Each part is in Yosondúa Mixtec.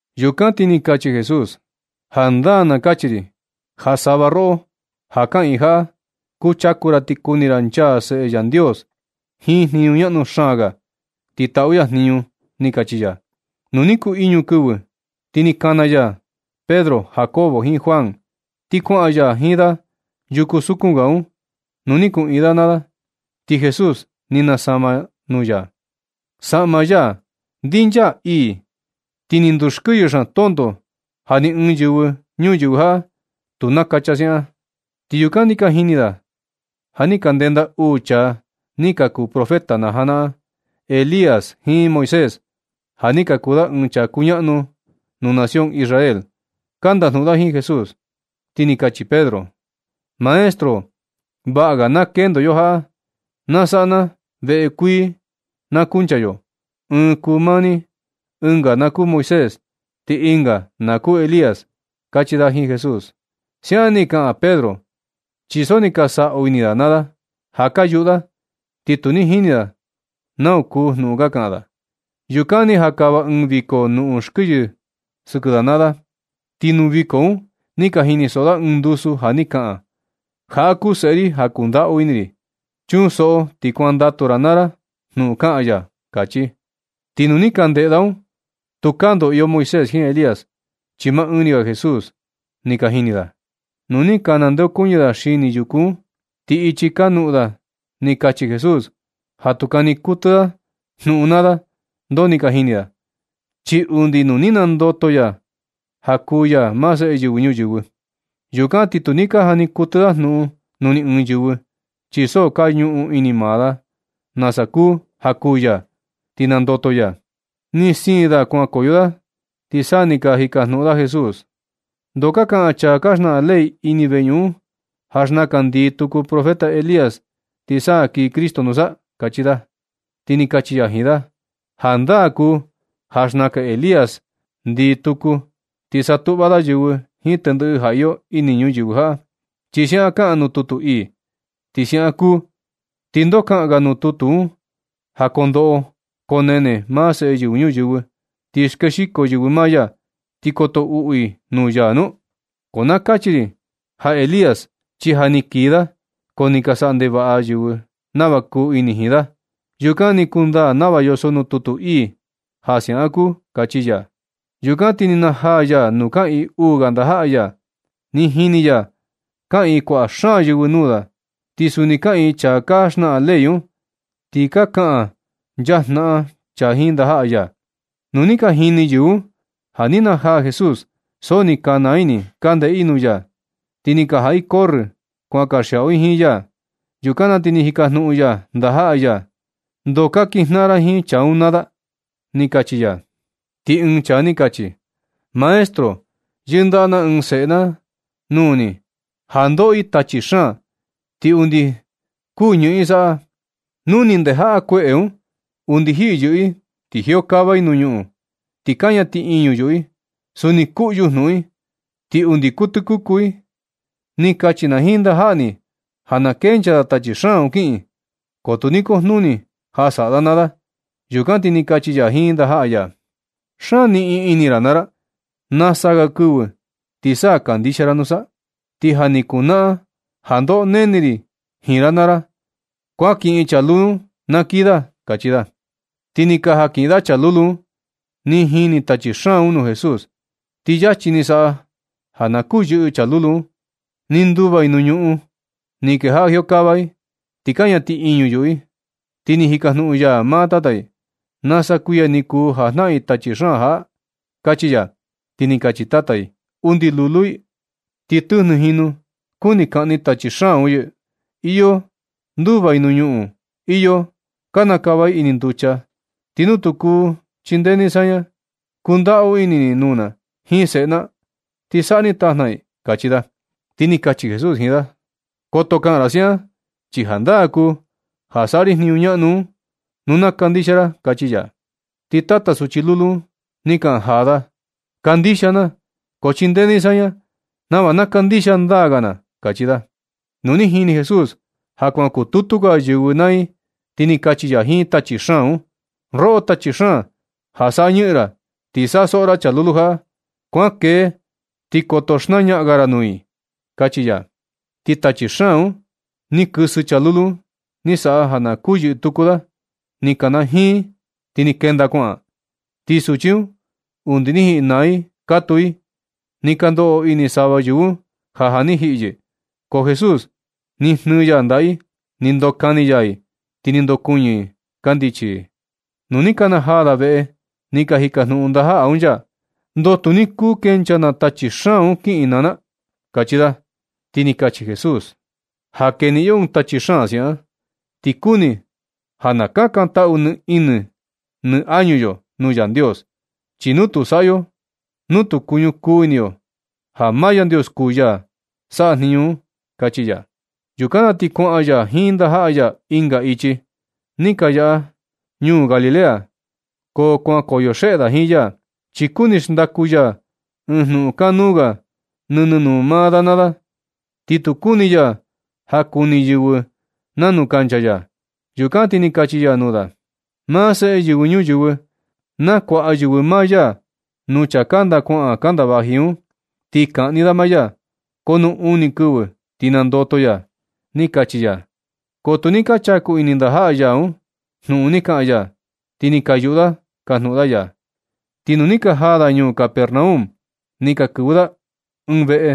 Yukan ti ni kachi Jesús: ―Jandaa na kachi ri ja sava roꞌo ja kaꞌiin jaꞌa kuchaku ra ti kuni ra nchaa Seꞌe Yandios jiin jniñu ñaꞌnu xaan ga, ti taꞌu ya jniñu ―ni kachi ya. Nu ni kuu iñu kɨvɨ ti ni kana ya Pedro, Jacobo jiin Juan, ti kuaꞌan ya jiin da yuku sukun ga un nuu ni kuꞌiin da naa da. Ti Jesús ni nasama nuu ya. Saꞌma ya ndinchaa ii. Ti ni ndukɨyɨ xaan tonto ja ni ɨɨn yɨvɨ ñuyɨvɨ jaꞌa tu nakacha siaꞌan. Ti yukan ni ka jini da ja ni ka ndenda uu chaa ni ka kuu profeta na janaꞌan Elías jiin Moisés, ja ni kuu da ɨɨn chaa kuñaꞌnu ga nuu nación Israel, ka ndajnuꞌun da jiin Jesús. Ti ni kachi Pedro: ―Maestro, vaꞌa ga na kendo yo jaꞌa. Na saꞌa na veꞌe kuii na kunchaa yo. Ɨɨn kuu maa ni, ɨnga na kuu Moisés, ti ɨnga na kuu Elías ―kachi da jiin Jesús. Siaꞌan ni kaꞌan Pedro, chi so ni ka saꞌu ini da naa da ja ka yuꞌu da, ti tu ni jini da nau kuu jnuꞌun kaꞌan da. Yukan ni jakava ɨɨn viko nuꞌun sɨkɨ da naa da, ti nuu viko un ni ka jinisoꞌo da ɨɨn ndusu ja ni kaꞌan: ―Jaꞌa kuu Seꞌe ri ja kundaꞌu ini ri. Chunsoꞌo ti kuandatu ra naa ra jnuꞌun kaꞌan ya ―kachi. Ti nu ni ka ndeꞌe da un, tukaa ndoo iyo Moisés jiin Elías, chi maa ni ga Jesús ni ka jini da. Nu ni ka nandeokuñɨ da xini yuku un, ti ichi ka noꞌon da ni kachi Jesús ja tu kani kuɨtɨ da jniñu naa da ndoo ni ka jini da, chi undi nu ni nandoto ya ja kuu ya maa Seꞌe Yɨvɨ Ñuyɨvɨ. Yukan ti tu ni ka jani kuɨtɨ da jnuꞌun nuu ni ɨɨn yɨvɨ, chi so ka ñuꞌun ini maa da nasa kuu ja kuū ya, ti nandoto ya. Ni siin da kuankoyo da ti sa ni ka jikajnuꞌun da Jesús: ―¿Ndoo ka kaꞌan chaa ka xnaꞌan ley ini veñuꞌun un ja xnakan ndii tuku profeta Elías, ti sa kii Cristo nusa? ―kachi da. Ti ni kachi ya jiin da: ―Jandaa kuu ja xnakan Elías ndii tuku, ti satuꞌva da yɨvɨ jiin tendɨꞌɨ ja iyo ini ñuyɨvɨ jaꞌa, chi siaꞌan kaꞌan nuu tutu ii. Nu siaꞌan kuu, ¿ti ndoo kaꞌan ga nuu tutu un ja koo ndoꞌo koo nene maa Seꞌe Yɨvɨ Ñuyɨvɨ, ti skexiko yɨvɨ maa ya, ti koto uꞌu i nuu ya nu? Ko na kachi ri ja Elías, chi ja ni kii da, ko ni ka saꞌa ndevaꞌa yɨvɨ nava kuu ini jiin da. Yukan ni kundaa nava yoso nuu tutu ii ja siaꞌan kuu ―kachi ya. Yukan ti ni najaa ya nuu kaꞌiin uu ga ndajaꞌa ya, ni jini ya kaꞌiin kuaꞌa xaan yɨvɨ nuu da, ti suni kaꞌiin chaa ka xnaꞌan ley un, ti ka kaꞌan nchaa jnaꞌan chaa un jiin ndajaꞌa ya. Nu ni ka jini yɨvɨ un ja ni najaa Jesús, so ni ka naa ini i ka ndeꞌe i nuu ya. Ti ni ka jaꞌa i corrɨ kuan kanxiaꞌu jiin ya. Yukan na ti ni jikajnuꞌun ya ndajaꞌa ya: ―¿Ndoo ka kijnaꞌan ra jiin chaa un naa da? ―kachi ya. Ti ɨɨn chaa ni kachi: ―Maestro, yɨndaꞌa na ɨɨn seꞌe na nuu ni ja ndoꞌo i tachi xaan, ti undi kuu ñɨꞌɨn i saꞌa. Nu ni ndejaꞌa kueꞌe un, undi jiyɨꞌɨ i ti jiokava i nuu ñuꞌun, ti kaña tiꞌiñu yuꞌu i. Suni kuꞌyu jnuꞌun i, ti undi kuu tɨkuku i. Ni kachi na jiin ndajaꞌa ni ja na kenchaa da tachi xaan un kiꞌin, ko tu ni kujnuni ja saꞌa da naa da. Yukan ti ni kachi ya jiin ndajaꞌa ya: ―Xaan niꞌin ini ra naa ra. Nasa ga kɨvɨ ti sa kandixia ra nusa. Ti ja ni kunaꞌan ja ndoꞌo nene ri jiin ra naa ra. Kuan kiꞌin chaa lulu un na kii da ―kachi ya. Ti ni ka jankiꞌin da chaa lulu un. Ni jini tachi xaan un nuu Jesús, ti luego ni, ni saꞌa ja na kuyɨꞌɨ chaa lulu un. Ni nduva i nuu ñuꞌun, ni kejaꞌa jiokava i, ti kaña tiꞌiñu yuꞌu i. Ti ni jikajnuꞌun ya maa tata i: ―¿Nasa kuiya ni kuu ja jnaꞌan i tachi xaan jaꞌa? ―kachi ya. Ti ni kachi tata i: ―Undi lulu i. Ti tɨjnɨ jinu kuni kaꞌni tachi xaan un yɨ. Iyo nduva i nuu ñuꞌun. Iyo kanakava i ini nducha. Ti nu kuu chindee ni saña, kundaꞌu ini ni nuu na jiin seꞌe na, ti saꞌa ni tajna i ―kachi da. Ti ni kachi Jesús jiin da: ―Koto kaꞌan ra siaꞌan, chi jandaa kuu ja saꞌa ri jniñu ñaꞌnu un nu na kandixia ra ―kachi ya. Ti tata suchi lulu un ni kaꞌan jaa da: ―¡Kandixia na, ko chindee ni saña nava na kandixia ndaa ga na! ―kachi da. Nu ni jini Jesús ja kuan kututu ga yɨvɨ naa i, ti ni kachi ya jiin tachi xaan un: ―Roꞌo tachi xaan, ja saꞌa ñɨꞌɨn ra, ti saꞌa soꞌo ra chaa lulu jaꞌa, kuankee ti koto xnañaꞌan ga ra nuu i ―kachi ya. Ti tachi xaan un ni kɨsɨ chaa lulu un, ni saꞌa ja na kuyɨꞌɨ tuku da, ni kanajiin, ti ni kenda kuaꞌan. Ti suchi un undi ni jiꞌi naa i katuu i. Ni ka ndoꞌo ini sava yɨvɨ un ja ja ni jiꞌi yɨ. Ko Jesús ni jnɨɨ ya ndaꞌa i, ni ndokani ya i, ti ni ndokuɨñɨ i kandichi i. Nu ni ka najaa da veꞌe, ni ka jikajnuꞌun ndajaꞌa un ya: ―¿Ndoo tu ni kuu kenchaa na tachi xaan un kiꞌin naa na? ―kachi da. Ti ni kachi Jesús: ―Ja keniꞌin yo ɨɨn tachi xaan siaꞌan, ti kuni ja na kakantaꞌu nɨ ini nɨ añu yo nuu Yandios. Chi tu kuu saꞌa yo nu tu kuñukuu ini yo ja maa Yandios kuu ya saꞌa jniñu un ―kachi ya. Yukan na ti kuaꞌan ya jiin ndajaꞌa ya ɨnga ichi, ni ka yaꞌa da ñuu Galilea. Ko kuankoyo xeꞌe da jiin ya, chi kuni xndaku ya ɨɨn jnuꞌun kanuu ga nɨnɨ nuu maa da naa da, ti tu kuni ya ja kuni yɨvɨ nanu kancha ya. Yukan ti ni kachi ya nuu da: ―Maa Seꞌe Yɨvɨ Ñuyɨvɨ, nakuaꞌa yɨvɨ maa ya nuu chaa kanda kuaꞌan kanda vaji un, ti kaꞌni da maa ya. Ko nuu uni kɨvɨ ti nandoto ya ―ni kachi ya. Ko tu ni ka chaku ini ndajaꞌa ya un jnuꞌun ni kaꞌan ya, ti ni ka yuꞌu da kajnuꞌun da ya. Ti nu ni ka jaa da ñuu Capernaum, ni ka kɨvɨ da ɨɨn veꞌe,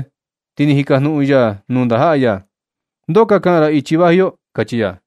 ti ni jikajnuꞌun ya nuu ndajaꞌa ya: ―¿Ndoo ka kaꞌan ra ichi vaji yo? ―kachi ya.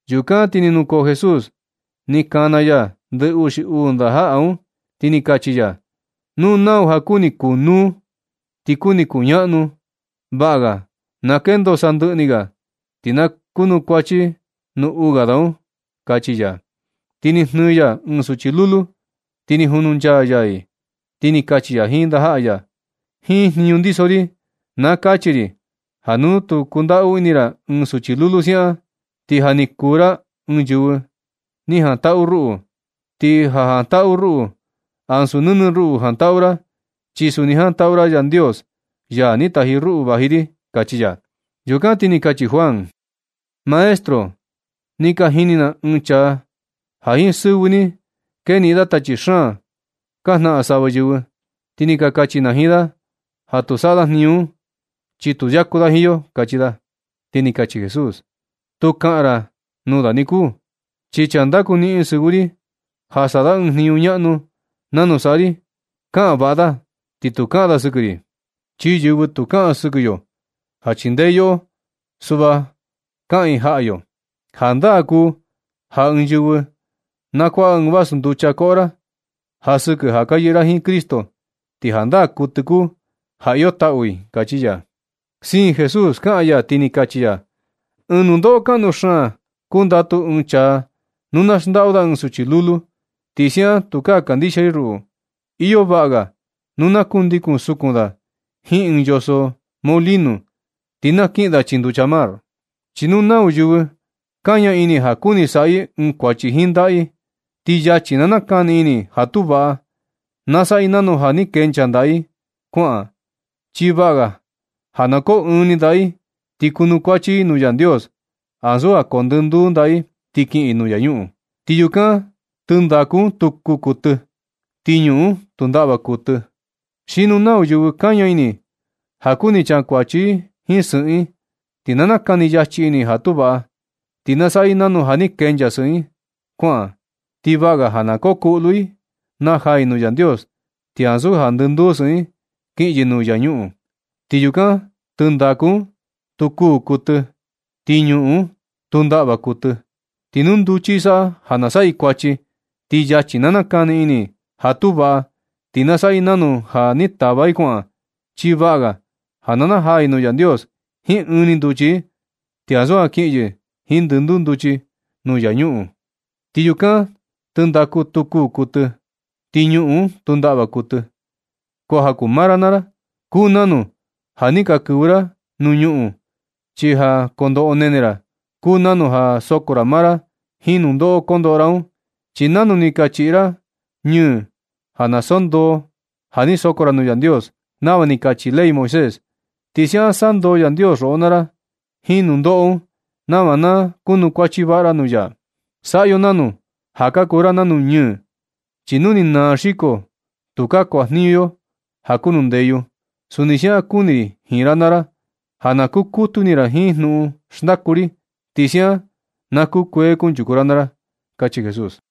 Yukan ti ni nukoo Jesús, ni kana ya ndɨ uxi uu ndajaꞌa un, ti ni kachi ya: ―Nu nau ja kuni kunúú, ti kuni kuñaꞌnu, vaꞌa ga na kendo sandɨꞌɨ ni ga, ti na kunukuachi nuu uu ga da un ―kachi ya. Ti ni jnɨɨ ya ɨɨn suchi lulu, ti ni jununchaa ya i, ti ni kachi ya jiin ndajaꞌa ya: ―Jiin jniñu ndiso ri na kachi ri ja nu na kundaꞌu ini ra ɨɨn suchi lulu siaꞌan, ti ja ni kuu ra ɨɨn yɨvɨ ni jantaꞌu ruꞌu. Ti ja jantaꞌu ra ruꞌu, ansu nɨnɨ ruꞌu jantaꞌu ra, chi suni jantaꞌu ra Yandios, ya ni taji ruꞌu vaji ri ―kachi ya. Yukan ti ni kachi Juan: ―Maestro, ni ka jini na ɨɨn chaa ja jiin sɨvɨ ni keniꞌin da tachi xaan ka jnaꞌan sava yɨvɨ. Ti ni ka kachi na jiin da ja tu saꞌa da jniñu un, chi tu yaku da jiin yo ―kachi da. Ti ni kachi Jesús: ―Tu kaꞌan ra nuu da niku, chi chaa ndaku niꞌin sɨvɨ ri ja saꞌa da ɨɨn jniñu ñaꞌnu nanu saꞌa ri kaꞌan vaꞌa da ti tu kaꞌan da sɨkɨ ri. Chi yɨvɨ tu kaꞌan sɨkɨ yo ja chindee i yoꞌo, suꞌva kaꞌan i jaꞌa yo. Jandaa kuu ja ɨɨn yɨvɨ na kuaꞌa ɨɨn vasu nducha koꞌo ra ja sɨkɨ ja ka yɨꞌɨ ra jiin Cristo, ti jandaa kuɨtɨ kuu ja iyo taꞌu i ―kachi ya. Siin Jesús kaꞌan ya, ti ni kachi ya: ―Ɨɨn nundoꞌo kaꞌnu xaan kundatu ɨɨn chaa nu na xndaꞌu da ɨɨn suchi lulu, ti siaꞌan tukaa kandixia i ruꞌu. Iyo vaꞌa ga nu na kundikun sukun da jiin ɨɨn yoso molino, ti na kiꞌin da chii nducha mar. Chi nu nau yɨvɨ kaña ini ja kuni saꞌa i ɨɨn kuachi jiin ndaꞌa i, ti yachi na nakani ini i ja tu vaꞌa. Na saꞌa i nanu ja, ja ni kenchaa ndaꞌa i un kuaꞌan. Chi vaꞌa ga na koo ɨɨn ni ndaꞌa i, ti kunukuachi i nuu Yandios ansu ja koo ndɨ nduu ndaꞌa i, ti kiꞌin i nuu infiernu. Ti yukan, tɨndaku un tu kuū tɨ, ti ñuꞌun un tu ndaꞌva kuɨtɨ. Xi nu nau yɨvɨ kaña ini i ja kuni kunchakuachi i jiin sɨꞌɨn i, ti na nakani yachi ini ja tu vaꞌa. Ti na saꞌa i nanu ja, ja ni kenchaa sɨꞌɨn i un kuaꞌan. Ti vaꞌa ga na koo kuꞌlu i najaa i nuu Yandios, ti ansu ja jiin ndɨnduu sɨꞌɨn i kiꞌin yɨ nuu infiernu. Ti yukan tɨndaku un, tu kuū tɨ, ti ñuꞌun un tu ndaꞌva kuɨtɨ. Ti nu nduchi i saꞌa ja na saꞌa i kuachi, ti yachi na nakani ini i ja tu vaꞌa. Ti na saꞌa i nanu ja, ja ni tava i kuaꞌan. Chi vaꞌa ga na najaa i nuu Yandios jiin ɨɨn ni nduchi i ti ansu ja kiꞌin yɨ jiin ndɨnduu nduchi i nuu infiernu. Ti yukan tɨndaku tu kuū tɨ, ti ñuꞌun un tu ndaꞌva kuɨtɨ. Ko ja kuu maa ra naa ra, kuu nanu ja ni ka kɨvɨ ra nuu ñuꞌun, chi ja kondoꞌo koo nene ra, kuu nanu ja soko ra maa ra jiin nundoꞌo kondoꞌo ra un. Chi nanu ni ka chiꞌi ra ñɨɨ ja na sandoo ja ni soko ra nuu Yandios, nava ni kachi ley Moisés, ti siaꞌan sandoo Yandios roꞌo naa ra jiin nundoꞌo un, nava na kunukuachi vaꞌa ra nuu ya. Saꞌa yo nanu ja ka kuu ra nanu ñɨɨ, chi nu ni naa xiko, tukaa kuajniñu yo ja kuu nuu ndeyu. Suni siaꞌan kuni ri jiin ra naa ra ja na kukutu ini ra jiin jnuꞌun xndaku ri, ti siaꞌan na kukuee kunchuku ra naa ra ―kachi Jesús.